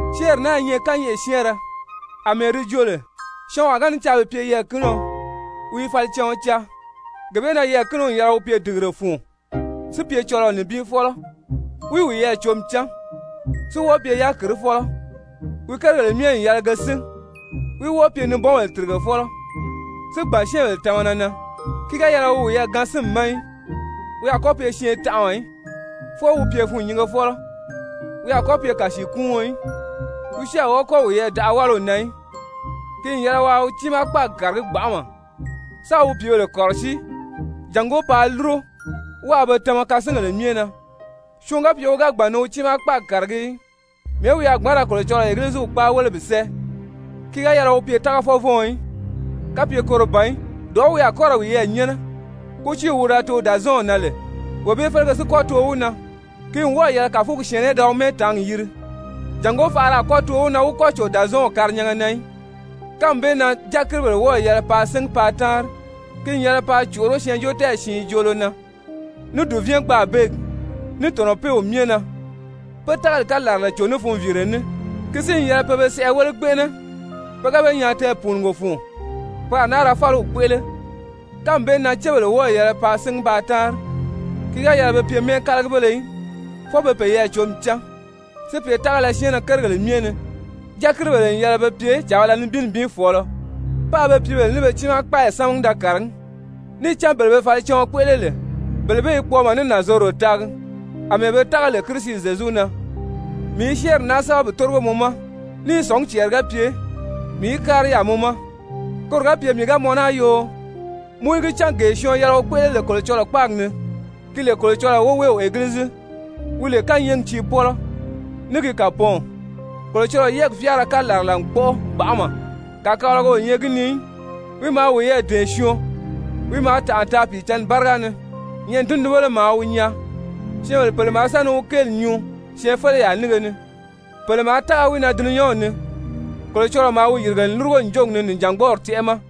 Syɛ́ɛnri naa i nyɛ kányɛʔɛ syɛ́ɛnrɛ àmɛɛ di joo lè syɔɔnwaa ga ni caa bi pye yɛɛ̀kinio, wi i falicaɔn caa. Gee bee na yɛɛ̀kinio n yɛlɛ wi pye dìgire fun, si pye cɔlɔɔ nibin fɔ́lɔ, wí wiyɛɛ cǒmi cán, si wɔ́ɔ pye yákirifɔlɔ, wi kérigèle myɛ n yɛlɛ ge sín, wí wɔ́ɔ pye nibɔnbèle tìrigefɔlɔ, si gbàn syɛ́ɛnbèle tamana na, ki ga yɛlɛ wi wiyɛɛ gaan sínmi ma í, wi a kɔ́ pye syɛɛntanʔaɔ í, fwɔɔ wi pye fûnnyingefɔlɔ, wi a kɔ́ pye kàsiikuuɔn í, wi si a wɔ́ɔ kɔ́ wiyɛɛ daʔa wáliw na í. Ki n yɛlɛ waa wi tiimaa kpáagi kàragí gbanʔama, sáā wi pìíbèle kɔ̀rɔsíi jàngó paa lúro, wáā be tama kasingèle myɛ na. Syɔɔn ga pye wi ga gbàn ni wi tiimaa kpáagi kàragí í, mɛ̀ɛ́ wi a gbǎn ra Kolocɔlɔɔ Egiliziw kpáa wéle bi sɛ́ɛ? Ki ga yɛlɛ wi pye tágafɔvɔɔn í, kapye koro ban í dɔ̀ʔɔ́ wi a kɔ́ ra wiyɛɛ nyɛ́nɛ, kútiiw wi da too Dàzɔɔnw na lè wee bee félege si kɔ́ too wi na. Ki n wɔ́ɔ̀ yɛlɛ kàfugi syɛ̀ɛnnɛ í da wi mɛ́ɛtaangi yiri jàngó faʔara a kɔ́ too wi na wi kɔ́ cò Dàzɔɔnw karinyanga na í. Kánmi bee na dyakiribèle wɔ́ɔ̀ yɛlɛ paa síngi paa táanri, ki n yɛlɛ paa còʔoró syɛɛnjóotɛɛyi siin joolo na, ní dùvɛɛn-gbaabeegi, ní tɔ̀nɔpeew myɛ na, pé tágali kalarala cò ní funviire ní. Ki si n yɛlɛ pe be sɛʔɛ wéle gbɛnʔɛnɛ, pe ga be nyaa tɛɛpùunugo fun, pe a náa ra fáliw kpéʔele. Kánmi bee na cébèle wɔ́ɔ̀ yɛlɛ paa síngi paa táanri, ki ga yɛlɛ be pye mɛ́ɛkalagibéle í, fwɔɔ be peyɛɛ cǒmi cán, si pye tágala syɛɛnnɛ kérigèle myɛ ni. Dyakiribèle n yɛlɛ be pye càbala nibin nibin fɔ̀ɔlɔ, páā be pìíbèle ní be tiimaa kpáayi sámagi da kàragí. Níì cán bele be falicaɔn kpéʔele lè, bele bee i kpɔɔmɔ, ní nànzorodo taagi àmɛɛ be tága lè Kirisi Zyezu na. Mii i syɛ́ɛnri naa sɛ́bɛ bi tórigo mɔ ma ní i sɔ̀ngí cɛɛri ga pye mii í kári yaà mɔ ma. Koro ga pye mii ga mɔn naa yoo, mɔ í gi cán, gee syɔɔn yɛlɛ wi kpéʔele lè Kolocɔlɔɔ kpáagi ni, ki lè Kolocɔlɔɔ Woweew Egilizi, wi lè kányɛɛgi tiipɔlɔ ní gi kàpɔɔnw. Kolocɔlɔɔ yɛ́ɛgi fyáara kalarala n kpɔ́ʔɔ gbanʔama, kàkabalaga o nyɛ gi ni í, wi maa wiyɛɛ dɛ̀ɛn syɔɔn, wi maa tànʔa taa Pìicǎnni báriga ni, nyɛ̀ʔɛni tundunbéle maa wi nyaa, syɛ́ɛnbèle pèle maa sa ni wi kéeli nyuu syɛɛnfeleyaa nínge ni, pèle maa tága wi na dulunyanw ni, Kolocɔlɔɔ maa wi yìrige n lúrugo ǹjogi ni nìjangbɔɔri tɛ́ʔɛ ma.